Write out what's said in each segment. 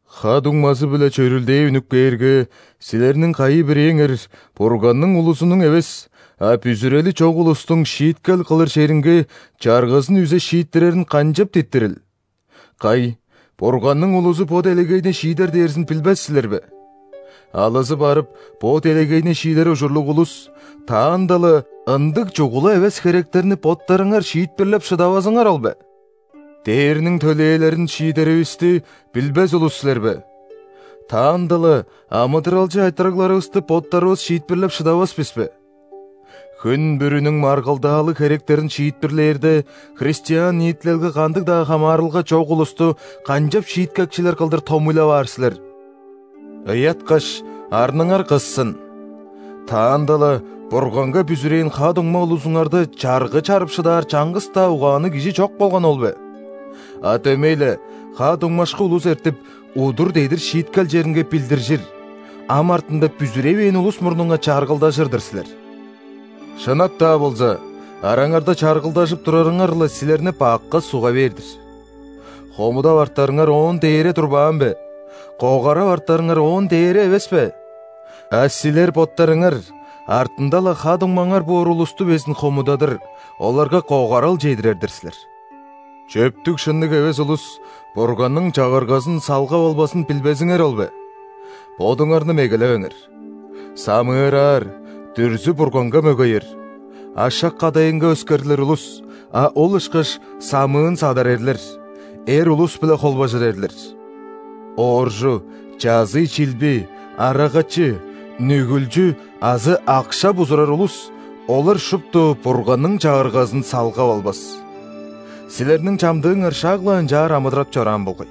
Ха-дуңмазы-биле чөрүлдээ үнүп кээрге, силерниң кайы-бирээңер Бурганның улузунуң эвес, а бүзүрели чок улустуң шииткел кылыр черинге чаргызын үзе шииттирерин канчап диттирил? Кай, Бурганның улузу бо делегейни шиидер дээрзин билбес силер бе? Алызы барып бо делегейни шиидер ужурлуг улус, таанда-ла ындыг чугула эвес херектерни боттарыңар шиитпирлеп шыдавазыңар ол бе? Дээрниң төлээлерин шиидеривисти билбес улус силер бе? Таанда-ла амыдыралчы айтырыгларывысты боттарывыс шиитпирлеп шыдавас бис бе? Хүн бүрүнүң маргылдаалыг херектерин шиитпирлээрде, христиан ниитилелге кандыг-даа хамаарылга чок улусту канчап шииткекчилер кылдыр томуйлап аар силер? Ыяткаш, арныңар кыссын! Таанда-ла Бурганга бүзүрээн ха-дуңма улузуңарда чаргы чарып шыдаар чаңгыс-даа угаанныг кижи чок болганы ол бе? А дөмей-ле, ха-дуңмашкы улус эртип, удур-дедир шииткел черинге билдиржир, ам артында бүзүревээн улус мурнунга чаргылдажыр-дыр силер. Шынап-даа болза, араңарда чаргылдажып турарыңар-ла силерни бакка суга бээр-дир. Хомудап артарыңар оон дээре турбаан бе? Когарап артарыңар оон дээре эвес бе? А силер боттарыңар артында-ла ха-дуңмаңар боор улусту безин хомудадыр, оларга когарал чедирер-дир силер. Чөптүг-шынныг эвес улус Бурганның Чагыргазын салгап албазын билбезиңер ол бе? Бодуңарны мегелевеңер. Самыыраар, дүрзү-бурганга мөгеер, ашак-кадайынга өскерлир улус, а ол ышкаш самыын-садар эрлер, эр улус-биле холбажыр эрлер; ооржу, чазый-чилби, арагачы, нүгүлчү азы акша бузурар улус – олар шупту Бурганның Чагыргазын салгап албас. Силерниң чамдыыңар шак-ла ынчаар амыдырап чораан болгай.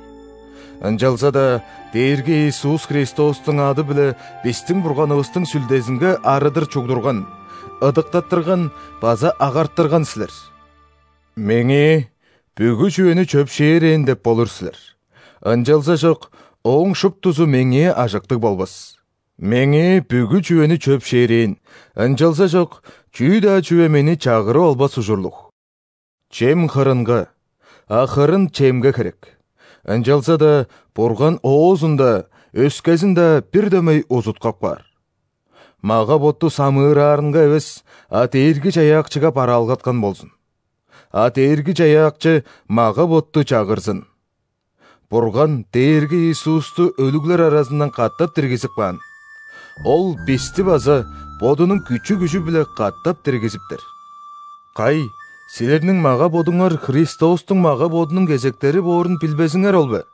Ынчалза-даа Дээрги Иисус Христостуң ады-биле бистиң Бурганывыстың Сүлдезинге арыдыр чугдурган, ыдыктаттырган база агартырган силер. «Меңээ бүгү чүвени чөпшээрээн» – деп болур силер, ынчалзажок ооң шуптузу меңээ ажыктыг болбас. «Меңээ бүгү чүвени чөпшээрээн», ынчалзажок чүү-даа чүве мени чагырып албас ужурлуг. «Чем – хырынга, а хырын – чемге херек», ынчалза-даа Бурган оозун-даа, өскезин-даа бир дөмей узуткап каар. Мага-ботту самыыраарынга эвес, а Дээрги-Чаяакчыга бараалгаткан болзун; а Дээрги-Чаяакчы мага-ботту чагырзын. Бурган Дээрги Иисусту өлүглер аразындан катап диргизип каан; Ол бисти база Бодунуң күчү-күжү-биле катап диргизиптер. Кай, силерниң мага-бодуңар Христостуң мага-бодунуң кезектери боорун билбезиңер ол бе?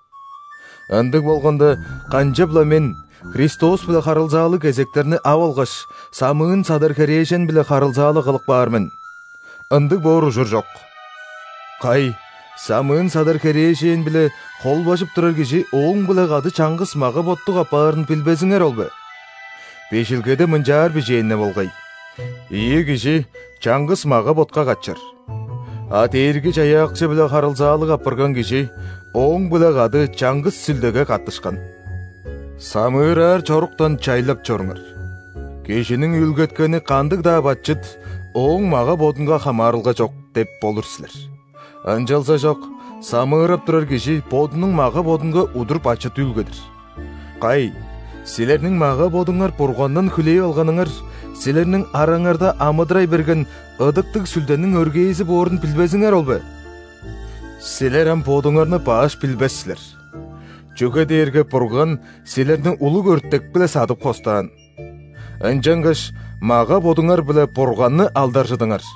Ындыг болганда, канчап-ла мен, Христос-биле харылзаалыг кезектерни ап алгаш, самыын-садар херээжен-биле харылзаалыг кылып каар мен? Ындыг боор ужур чок! Кай, самыын-садар херээжен-биле холбажып турар кижи ооң-биле кады чаңгыс мага-боттуг апаарын билбезиңер ол бе? Бижилгеде мынчаар бижээн-не болгай: «Ийи кижи чаңгыс мага-ботка катчыр». А Дээрги-Чаяакчы-биле харылзаалыг апарган кижи Ооң-биле кады чаңгыс Сүлдеге каттышкан. Самыыраар чоруктан чайлап чоруңар. «Кижиниң үүлгеткени кандыг-даа бачыт ооң мага-бодунга хамаарылга чок» деп болур силер, ынчалзажок самыырап турар кижи бодунуң мага-бодунга удур бачыт үүлгедир. Кай, силерниң мага-бодуңар Бургандан хүлээп алганыңар, силерниң араңарда амыдырай берген Ыдыктыг Сүлдениң өргээзи боорун билбезиңер ол бе? Силер ам бодуңарны баш билбес силер! Чүге дээрге Бурган силерни улуг өртек-биле садып хостаан. Ынчангаш мага-бодуңар-биле Бурганны алдаржыдыңар!